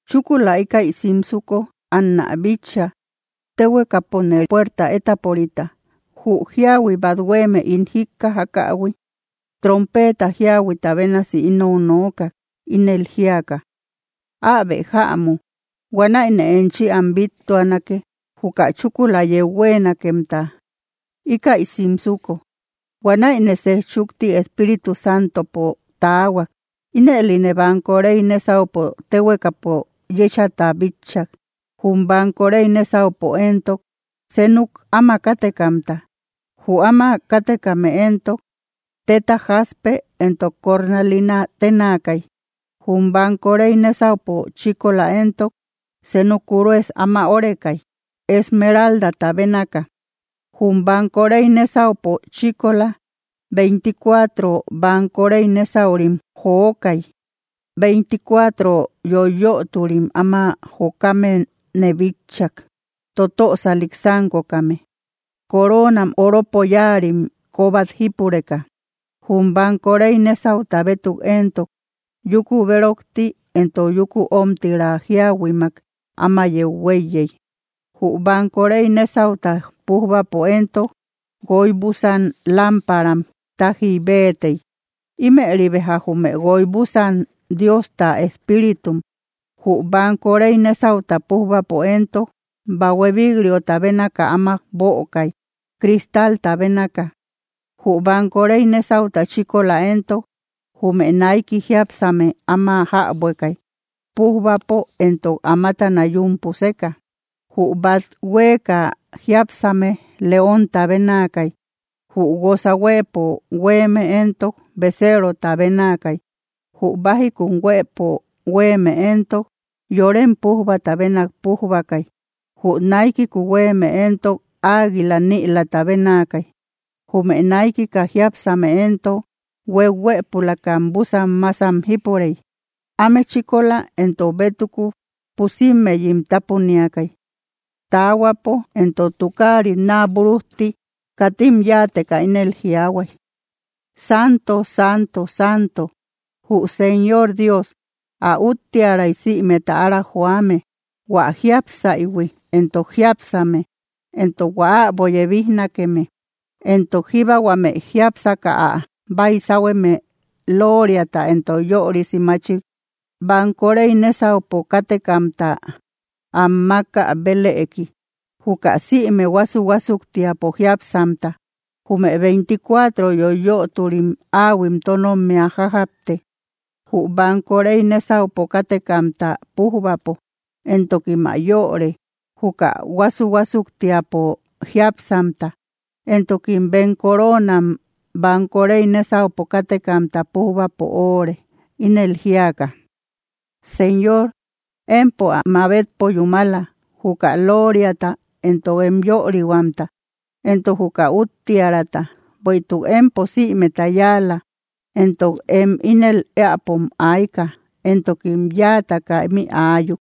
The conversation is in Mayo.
Chúkula ikäi simsuko anä bitcha, téhuekapo puerta étaporita; Jü jíahui bát huéeme ín jíkkajakähui, trompeeta jíahuita bénasi inou nookak, ínel jíaka: —¡Äbe jämu! Huanäine enchi am bíttuanake, juka chúkula yeu huéenakemta, íkäi simsuko. Huanäine sej chukti Espíritu Santopo taahuak. Ínëline banko rey nésaupo téhuekapo yéchata bitchak, jum banko rey nésaupo éntok, seenuk áma kátekamta. Jü áma kátekame éntok, téta jaspe entok cornalina ténaakay. Jum banko rey nésaupo chíkola éntok senu kurues ama órekay, esmeraldata bénaaka. Jum banko rey nésaupo chíkola, veinticuatro banko rey nésaurim jokay. Veinticuatro yoiyöturim áma jokamene bitchak, totösalik sánkokame, coroonam oropo yáarim kóbat jípureka. Jum banko rey nésauta bétuk éntok, yúku bérokti entok yúku omtira jíahuimak áma yeu huéiyey. Jü banko rey nésauta pújbapo éntok, guoy búsan lámparam tájiy béetey. Ímëri beja jume guoy búsan Diosta espíritum. Jü banko rey nésauta pújbapo éntok, bahue bík‑riota bénaka áma bökay, cristalta bénaka. Jü banko rey nésauta chíkola éntok, jume naiki jiápsame áma jäbuekay, pújbapo entok amatana yún puseka. Jü bát huéeka jiápsame leonta bénaakay. Jü guósa huëpo huéeme éntok, beceerota bénaakay. Jü bájikun huëpo huéeme éntok, yorem pújbata bénak pújbakay. Jü naikiku huéeme éntok, águila nïlata bénaakay. Jume naikika jiápsame éntok, huéuhuëpulakam búsan másam jípurey. Áme chíkola entok bétuku pusimmeyim tápuniakay. Taahuapo entok tukaarit naa búrujti katim yáateka ínel jiaahuay: Santo, santo, santo, jü Señor Dios, ä úttiäray sïmeta ára joame, hua jiápsaïhui, entok jiápsame, entok hua äbo yebijnakeme. Entok jíbba huame jiápsaka ä baysahueme lóoriata entok yörisi maachik banko rey nésaupo kátekamta am mákä bélëki, juka sïme huásu‑huásuktiapo jiápsamta, jume veinticuatro yoiyöturim áahuim tónommia jájapte, jü banko rey nésaupo kátekamta pújbapo, entokim ä yöre, juka huásu‑huásuktiapo jiápsamta; entokim bem coroonam banko rey nésaupo kátekamta pújbapo öore, ínel jíaka: Señor, empo ä mabetpo yúmala, juka lóoriata, entok em yörihuamta, entok juka úttiärata; bueïtuk empo sïmeta yáala, entok em ínel éäpom ayka, entokim yáataka ímï aayuk.